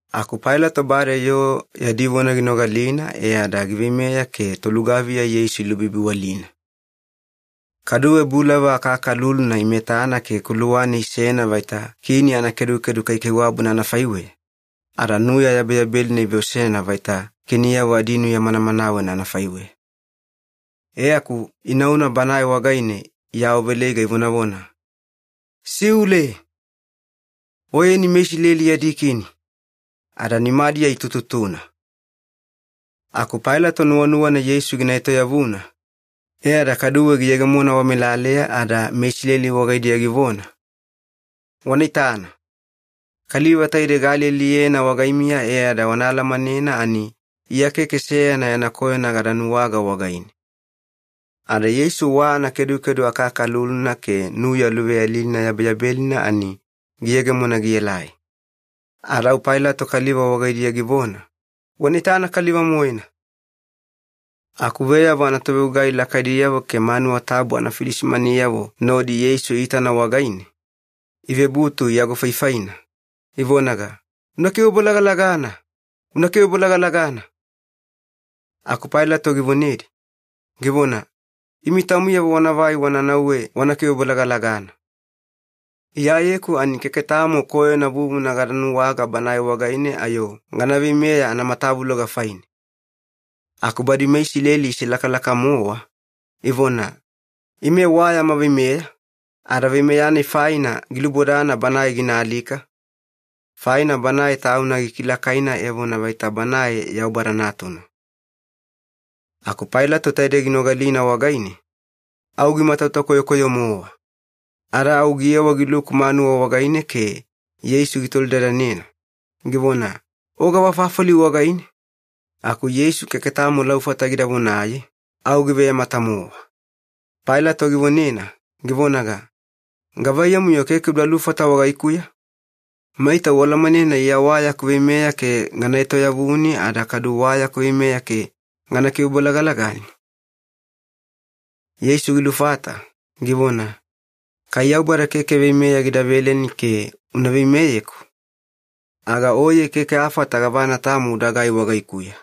Aku Pailato bade yoo yadi vona ginogalina e ada giveimeya ke tolugaviya Yeisu ilubibiwalina. Kaduwe bulava akakaluluna imetana ke kuluwane isena vaita kini anakedukedu kaikaiwabuna anafaiweya, ada nuya yabeyabelina iveosena vaita kiniyavo adinuya manamanawena anafaiweya. E aku inauna Banae wagaine iawaveleiga ivonavona, “Siule! Oyeni meIsileli yadi Kini!” Ada nimadiya itututuna. Aku Pailato nuwanuwana Yeisu gina etoyavuna, e ada kaduwe giyegemona wamelaleya ada meIsileli wagaidiya givona, “Wana itana. Kaliva taidei gaalialiyena wagaimiya e ada wana alamanena ani Iya keke seyana yana koyona gada nuwaga wagaine.” Ada Yeisu wa anakedukedu akakaluluna ke nuya luveyalilina yabeyabelina ani giyegemona gielai. Ada au Pailato kaliva wagaidiya givona, “Wana itana kaliva-moena!” Aku veyavo anatovegugai lakaidiyavo ke manuwa tabu anafilisimaniyavo nodi Yeisu iitana wagaine, ivebutu iagofaifaina, ivonaga, “Una kivebolagalagana! Una kivebolagalagana!” Aku Pailato givonedi, givona, “Imi taumiyavo wanavai wana nauwe wana kivebolagalagana. Iyayeku ani keke tamo koyona vuvuna gada nuwaga Banae wagaine ayo gana veimeya anamatavuloga faine.” Aku badi meIsileli iselakalaka-mowa, ivona, “Ime wa yama veimeya, ada veimeya-nai faina gilubodana Banae gina alika, faina Banae Tauna gikilakaina evona vaita Banae Yaubada Natuna.” Aku Pailato taidei ginogalina wagaine, au gimatauta koyokoyo-mowa. Ada au giyewa giluku manuwa wagaine ke Yeisu gitolidadanena, givona, “O gavafafali wagaine?” Aku Yeisu keke tamo laufata gida vonaye, au giveyamata-mowa. Pailato givonena, givonaga, “Gavaiyamu-yo keke uda lufata wagaikuya? Maita ualamanena Iya wa yaku veimeya ke gana etoyavuni ada kadu wa yaku veimeya ke gana kivebolagalagani?” Yeisu gilufata, givona, “Kai Yaubada keke veimeya gida veleni ke una veimeyeku, aga oye keke afata gavana tamo udagai wagaikuya.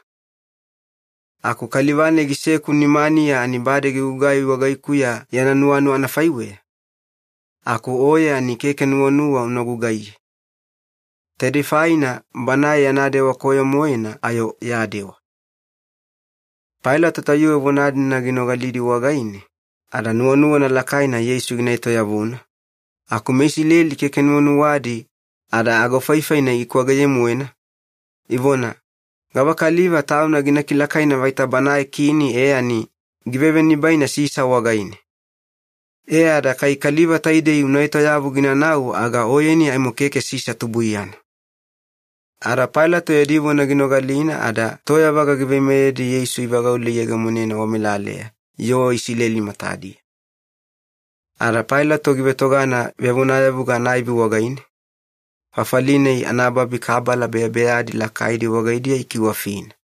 Aku kaliva-nai giseku nimaniya ani bade gigugai wagaikuya yana nuwanuwa anafaiweya, aku oye ani keke nuwanuwa una gugaiye. Taidei faina banae yana dewa koyo-moena ayo ya dewa.” Pailato tayuwe vona-dina ginogalidi wagaine, ada nuwanuwana lakaina Yeisu gina etoyavuna, aku meIsileli keke nuwanuwadi ada agofaifaina ikwageye-moena, ivona, “Gavakaliva tauna gina kilakaina vaita banae kini e ani givevenibaina Sisa wagaine. E ada kai kaliva taidei una etoyavu ginanau aga oyeni aimo keke Sisa tubuiyana.” Ada Pailato yadi vona ginogalina ada toyavaga giveimeyedi Yeisu ivagaule iyegemonena wamelaleya yoo Isileli matadiya. Ada Pailato givetogana vevonayavuga anaivi wagaine, fafali-nai anababi kabala beyabeyadi lakaidi wagaidiya ikiwafina.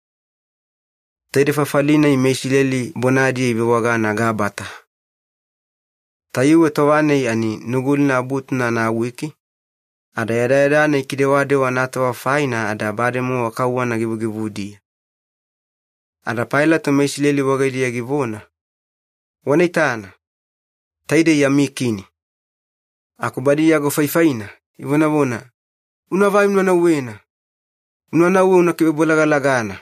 Taidei fafali-nai meIsileli bonadiya ivewagana ‘Gabata’. Tayuwe tova-nai ani Nugulina Abutuna anawiki, ada yadayada-nai kidewadewa anatova faina ada bademowa kauwana givugivudiya. Ada Pailato meIsileli wagaidiya givona, “Wana itana, taidei yami Kini!” Aku badi iagofaifaina, ivonavona, “Unavai una nauwena! Una nauwe una kivebolagalagana!”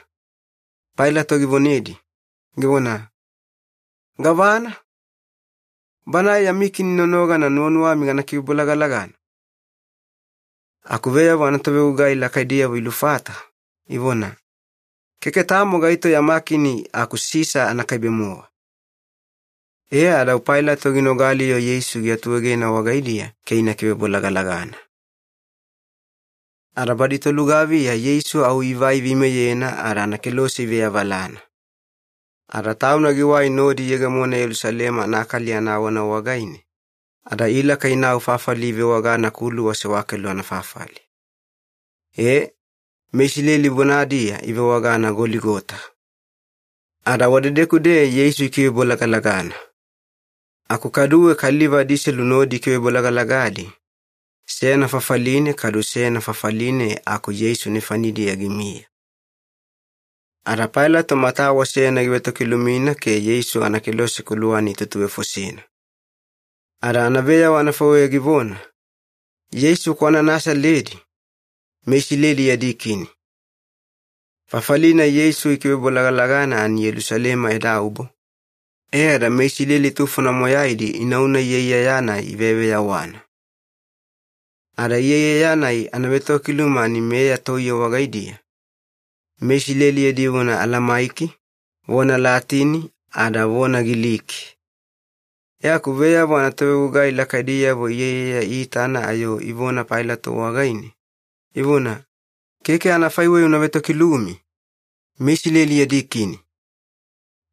Pailato givonedi, givona, “Gavana? Banae yami Kini nonogana nuwanuwami gana kivebolagalagana?” Aku veyavo anatovegugai lakaidiyavo ilufata, ivona, “Keke tamo gaito yama kini aku Sisa anakaibe-mowa.” E ada au Pailato ginogali-yo Yeisu giatuegena wagaidiya ke ina kivebolagalagana. Ada badi tolugaviya Yeisu au ivai iveimeyena ada anakelose iveavalana. Ada Tauna giwai nodi iyegemona Yelusalema anakali anawana wagaine, ada ilaka inau fafali ivewagana ‘Kuluwa Sewakelu Anafafali’. E, meIsileli bonadiya ivewagana ‘Goligota’. Ada wadedeku-deya Yeisu ikivebolagalagana. Aku kaduwe kaliva adiselu nodi ikivebolagalagadi, seyana fafaline kadu seyana fafaline aku Yeisu nefanidiya gimiya. Ada Pailato matawa seyana givetokilumina ke Yeisu anakelose kuluwane itutuvefosena. Ada anaveyawa taidei anafaiweya givona, “YEISU KWANA NASALEDI, MeISILELI YADI KINI.” Fafali-nai Yeisu ikivebolagalagana ani Yelusalema edaubo, e ada meIsileli tufona moyaidi inauna iyaiyaya-nai iveyaveyawana. Ada iyaiyaya-nai anavetokiluma ani meya toiye wagaidiya, meIsileli yadi vona Alamaiki, vona Latini, ada vona Giliki. E aku veyavo anatovegugai lakaidiyavo iyaiyaya iitana ayo ivona Pailato wagaine, ivona, “Keke anafaiweya una vetokilumi, ‘MeIsileli yadi Kini’.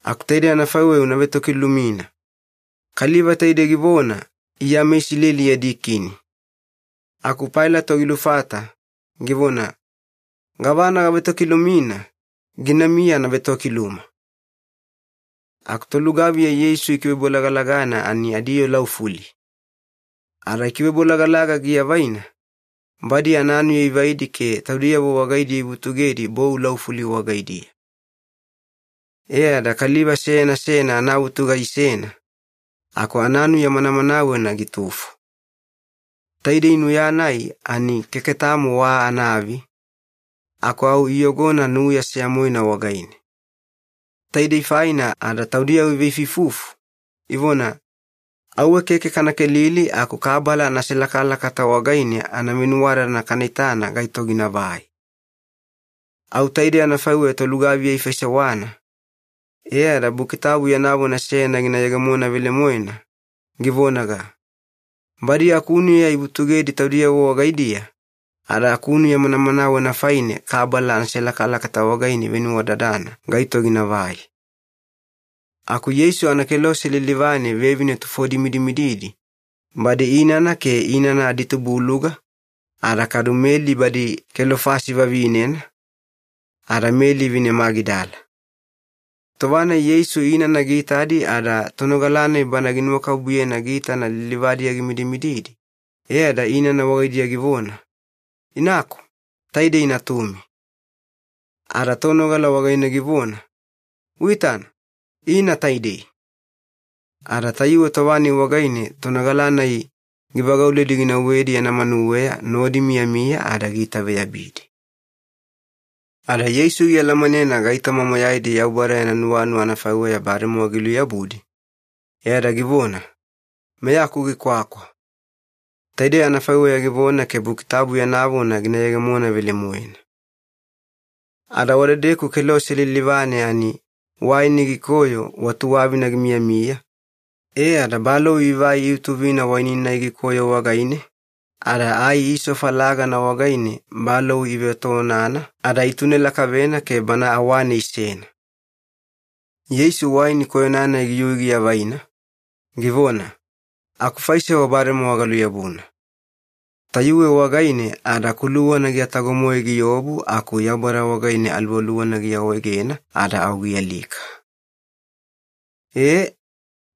Aku taide anafaiweya una vetokilumina, ‘Kaliva taidei givona, Iya MeIsileli yadi Kini.’” Aku Pailato gilufata, givona, “Gavana gavetokilumina, ginamiya anavetokiluma.” Aku tolugaviya Yeisu ikivebolagalagana ani adiyoo laufuli. Ada ikivebolagalaga giavaina, badi ananuya ivaidi ke taudiyavo wagaidiya ivutugedi bou laufuli wagaidiya. E ada kaliva seyana seyana anavutuga isena, aku ananuya manamanawena gitufo. Taidei nuya-nai ani keke tamo wa anaavi, aku au iyogona nuya seya-moena wagaine. Taidei faina ada taudiyavo iveifuifufu, ivona, “Auwe keke kana kelili aku kabala anaselakalakata wagaine anavenuwadadana kana itana gaito ginavai.” Au taidei anafaiweya tolugaviya ifaisewana, e ada Buki Tabu yana vona seyana gina yegemona velemoena, givonaga, “Badi akunuya ivutugedi taudiyavo wagaidiya, ada akunuya manamanawena faine kabala anaselakalakata wagaine ivenuwadadana gaito ginavai.” Aku Yeisu anakelose lilivane vevine tufodi imidimididi, badi inana ke inana aditubuluga, ada kadu Meli badi Kelofasi vavinena, ada Meli vine Magidala. Tova-nai Yeisu inana giitadi ada tonogala-nai bana ginuwakabubuyena giitana lilivadiya gimidimididi, e ada inana wagaidiya givona, “Inaku, taidei natumi.” Ada tonogala wagaine givona, “Uitana, ina taidei.” Ada tayuwe tova-nai wagaine tonogala-nai givagauledi ginauwedi yana manuweya nodi imiyamiya ada giitaveyabidi. Ada Yeisu gialamanena gaitoma moyaidi Yaubada yana nuwanuwa anafaiweya bademowa giluyabudi, e ada givona, “Meyaku gikwakwa.” Taidei anafaiweya givona ke Buki Tabu yana vona gina yegemona velemoena. Ada wadedeku kelose lilivane ani waini gikoyo wa tuwavina gimiyamiya, e ada balou ivai iutuvina waini-nai gikoyo wagaine, ada ai isofa lagana wagaine balou ive etoonana ada itune lakavena ke Bana awane isena. Yeisu waini koyona-nai giyui giavaina, givona, “Akufaisewa bademowa galuyabuna.” Tayuwe wagaine ada kuluwana giatago-moe giobu aku Yaubada wagaine aluwaluwana giawaegena ada au gialika. E,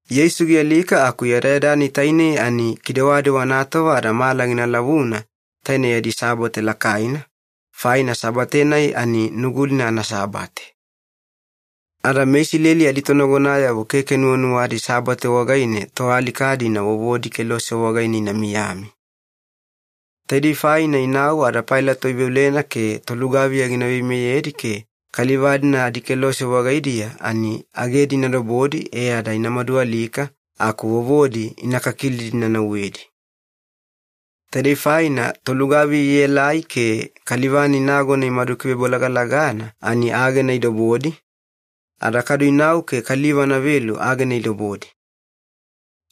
Yeisu gialika aku yadayada-nai tainei ani kidewadewa anatova ada mala gina lavuna taine yadi Sabate lakaina, faina Sabate-nai ani Nugulina anaSabate. Ada meIsileli aditonagonayavo keke nuwanuwadi Sabate wagaine toalika-dina vovodi kelose wagaidiya ina miyami. Taidei faina inau ada Pailato iveolena ke tolugaviya gina veimeyedi ke kaliva-dina adikelose wagaidiya ani agedi ina dobodi e ada ina madualika aku vovodi ina kakilidi ina nauwedi. Taidei faina tolugaviya ielai ke kaliva-nai nagona imadu kivebolagalagana ani agena idobodi, ada kadu inau ke kaliva anavelu agena idobodi.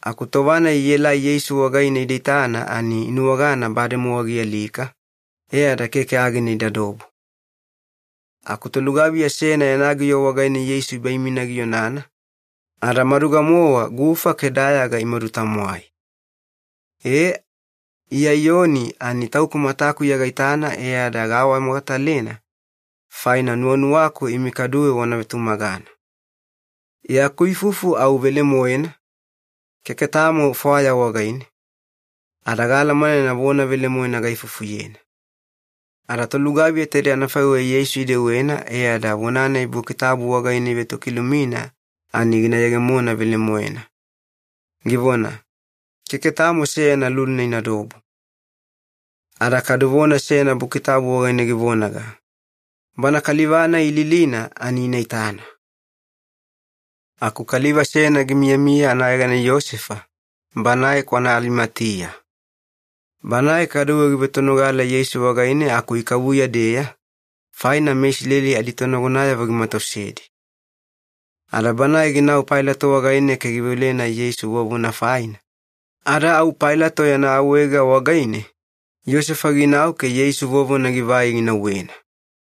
Aku tova-nai ielai Yeisu wagaine ida itana ani inuwagana bademowa gialika, e ada keke agena idadobo. Aku tolugaviya seyana yana giyo wagaine Yeisu ibaimina gionana, ada maduga-mowa gufa ke dayaga imadu-tamwai. E, Iya Iyoni ani tauku matakuya gaitana e ada gaawamogatalena, faina nuwanuwaku imi kaduwe wana vetumagana. Yaku ifufu au velemoena, keke tamo fwaya wagaine, ada gaalamanena vona velemoena gaifufuyena. Ada tolugaviya taide anafaiweya Yeisu idewena e ada vona-nai Buki Tabu wagaine ivetokilumina ani gina yegemona velemoena, givona, “Keke tamo seyana luluna inadobo.” Ada kadu vona seyana Buki Tabu wagaine givonaga, “Bana kaliva-nai ililina ani ina itana.” Aku kaliva seyana gimiyamiya anayegana Iyosefa, banae kwana Alimatiya. Banae kaduwe givetonogala Yeisu wagaine aku ikavuya-deya, faina meIsileli aditonagonayavo gimatausedi. Ada banae ginau Pailato wagaine ke giveolena Yeisu vovona faina, ada au Pailato yana awaega wagaine, Iyosefa ginau ke Yeisu vovona givai ginauwena.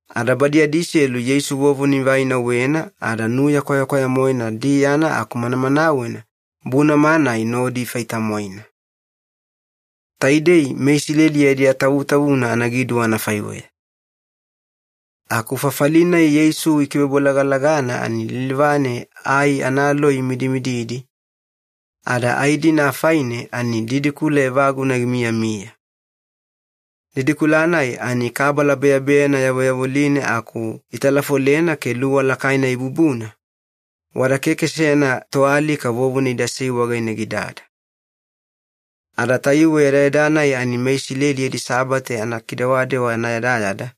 Ada badi adiselu Yeisu vovona ivai inauwena ada nuya kwayakwaya-moena diyana aku manamanawena bunama-nai nodi ifai-tamwaina. Taidei meIsileli yadi atavutavuna anagiduwa anafaiweya. Aku fafali-nai Yeisu ikivebolagalagana ani lilivane ai analoi imidimididi, ada ai-dina afaine ani didikula evaguna gimiyamiya. Didikula-nai ani kabala beyabeyana yavoyavoline aku italafolena ke luwa lakaina ibubuna, wada keke seyana toalika vovona idasei wagaine gidada. Ada tayuwe yadayada-nai ani meIsileli yadi Sabate anakidewadewa anayadayada,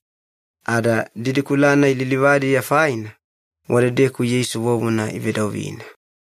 ada didikula-nai lilivadiya faina, wadedeku Yeisu vovona ivedauvina.